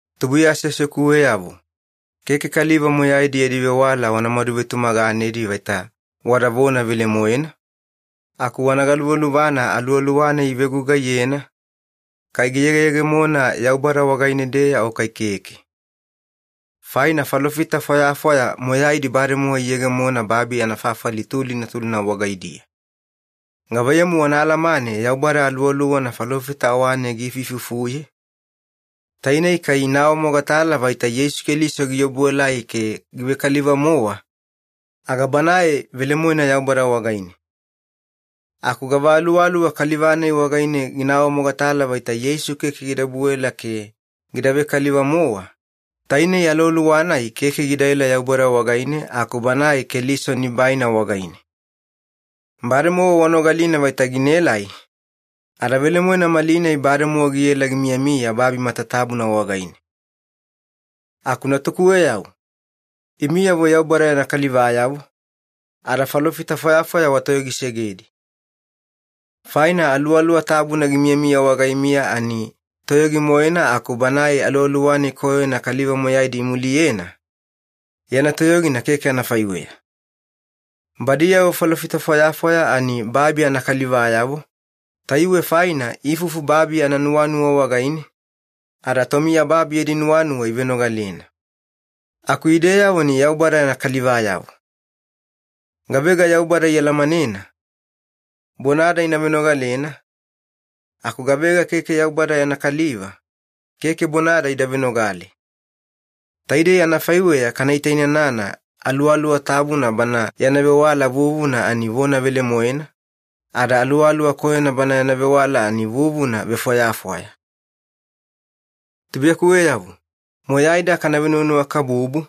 Tubuiya aseasekuweyavo, keke kaliva moyaidi yadi vewala wana madu vetumaganedi vaita wada vona velemoena, aku wana galuvaluvana aluwaluwa-nai ivegugaiyena, kai giyegeyegemona Yaubada wagaine-deya o kai keke. Faina falofita fwayafwaya moyaidi bademowa iyegemona babi anafafali tulina tulina wagaidiya. Gavaiyamu wana alamane Yaubada Aluwaluwana falofita awane giifuifufuye? Tainei kai ina awamogatala vaita Yeisu Keliso giobuelai ke givekaliva-mowa, aga banae velemoena Yaubada wagaine. Aku gava aluwaluwa kaliva-nai wagaine gina awamogatala vaita Yeisu keke gida obuela ke gida vekaliva-mowa, tainei aluwaluwa-nai keke gidaela Yaubada wagaine aku banae Keliso nibaina wagaine. Bademowa wanogalina vaita ginaelai, ada velemoena malinai bademowa giela gimiyamiya babi matatabuna wagaine. Aku natukuweyavo, imiyavo Yaubada yana kalivayavo, ada falofita fwayafwaya watoyogisegedi. Faina Aluwaluwa Tabuna gimiyamiya wagaimiya ani toyogi-moena aku banae aluwaluwa-nai koyona kaliva moyaidi imuliyena, yana toyogina keke anafaiweya. Badiyavo falofita fwayafwaya ani babi anakalivayavo, tayuwe faina iifufu babi ananuwanuwa wagaine, ada tomiyababi yadi nuwanuwa ivenogalena. Aku ideyavo ani Yaubada yana kalivayavo. Gavega Yaubada ialamanena, bonada ina venogalena, aku gavega keke Yaubada yana kaliva, keke bonada ida venogale. Taidei anafaiweya kana itainanana Aluwaluwa Tabuna Bana yana vewala vuvuna ani vona velemoena, ada aluwaluwa koyona bana yana vewala ani vuvuna vefwayafwaya. Tubuiyakuweyavo, moyaida kana venuwanuwakabubu,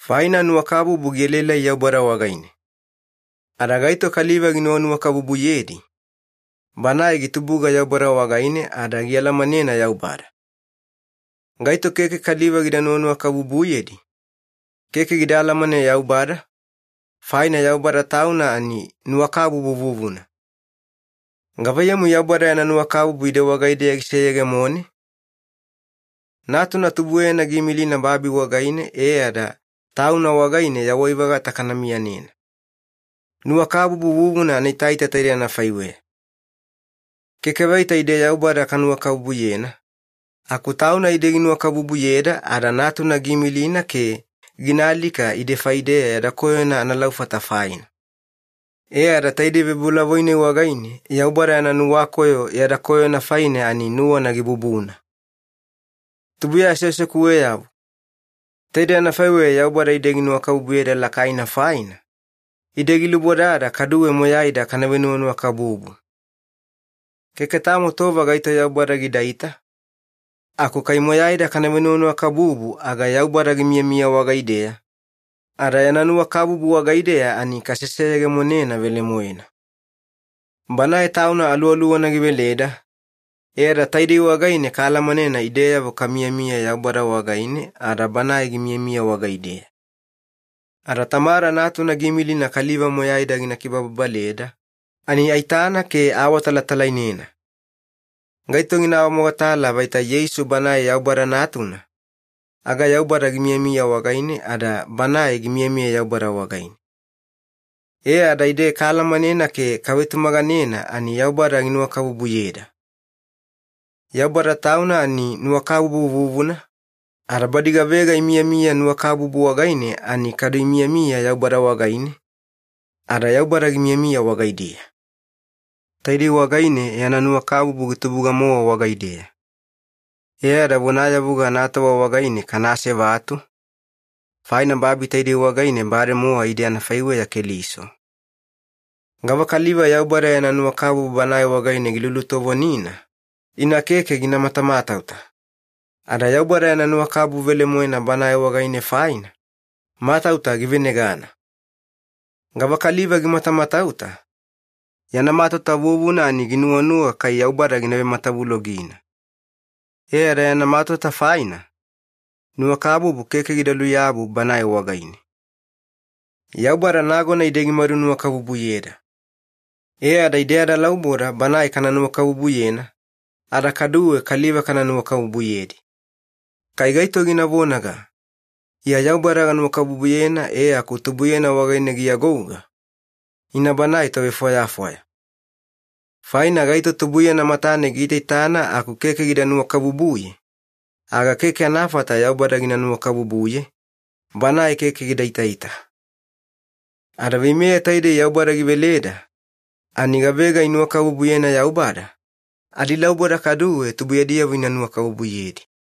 faina nuwakabubu gielaelai Yaubada wagaine. Ada gaito kaliva ginuwanuwakabubuyedi, banae gitubuga Yaubada wagaine ada gialamanena Yaubada. Gaito keke kaliva gida nuwanuwakabubuyedi, keke gida alamane Yaubada, faina Yaubada Tauna ani nuwakabubu vuvuna. Gavaiyamu Yaubada yana nuwakabubu ide wagaideya giseyegemone? Natuna tubueyana giimilina babi wagaine e ada Tauna wagaine yawai-vagata kana miyanena. Nuwakabubu vuvuna anaitaita taidei anafaiweya. Keke vaita ide Yaubada kanuwakabubuyena, aku Tauna ide ginuwakabubuyeda ada Natuna giimilina ke gina alika ide faideya yada koyona analaufata faina. E ada taidei vebolavoi-nai wagaine Yaubada yana nuwakoyo yada koyona faine ani nuwana gibubuna. Tubuiya aseasekuweyavo, taidei anafaiweya Yaubada ide ginuwakabubuyeda lakaina faina, ide gilubodada kaduwe moyaida kana venuwanuwakabubu. Keke tamo tova gaito Yaubada gidaita, aku kai moyaida kana venuwanuwakabubu aga Yaubada gimiyamiya wagaideya, ada yana nuwakabubu wagaideya ani kaseseyegemonena velemoena. Banae Tauna Aluwaluwana giveleda, e ada taidei wagaine kaalamanena ideyavo kamiyamiya Yaubada wagaine ada Banae gimiyamiya wagaideya. Ada Tamada Natuna giimilina kaliva moyaida gina kibababaleda, ani aitana ke aawatalatalainena. Gaito gina awamogatala vaita Yeisu Banae Yaubada Natuna, aga Yaubada gimiyamiya wagaine ada banae gimiyamiya Yaubada wagaine. E ada ide kaalamanena ke kavetumaganena ani Yaubada ginuwakabubuyeda. Yaubada Tauna ani nuwakabubu vuvuna, ada badi gavega imiyamiya nuwakabubu wagaine ani kadu imiyamiya Yaubada wagaine, ada Yaubada gimiyamiya wagaidiya. Taidei wagaine yana nuwakabubu gitubuga-mowa wagaideya. E ada vonayavuga anatova wagaine kana asevatu, faina babi taidei wagaine bademowa ide anafaiweya Keliso. Gavakaliva Yaubada yana nuwakabubu banae wagaine gilulutovonina, ina keke gina matamatauta. Ada Yaubada yana nuwakabubu velemoena banae wagaine faina, matauta givenegana. Gavakaliva gimatamatauta, yana matauta vuvuna ani ginuwanuwa kai Yaubada gina vematavulogina. E ada yana matauta faina, nuwakabubu keke gida luyabu banae wagaine. Yaubada nagona ide gimadunuwakabubuyeda. E ada ide adalauboda Banae kana nuwakabubuyena, ada kaduwe kaliva kana nuwakabubuyedi. Kai gaito gina vonaga, “Iya Yaubada ganuwakabubuyena” e aku tubuiyana wagaine giagouga, ina banae tovefwayafwaya. Faina gaito tubuiyana matane giitaitana aku keke gida nuwakabubuye, aga keke anafata Yaubada gina nuwakabubuye, Banae keke gida itaita. Ada veimeya taidei Yaubada giveleda, ani gavega inuwakabubuyena Yaubada, adilauboda kaduwe tubuiyadiyavo ina nuwakabubuyedi.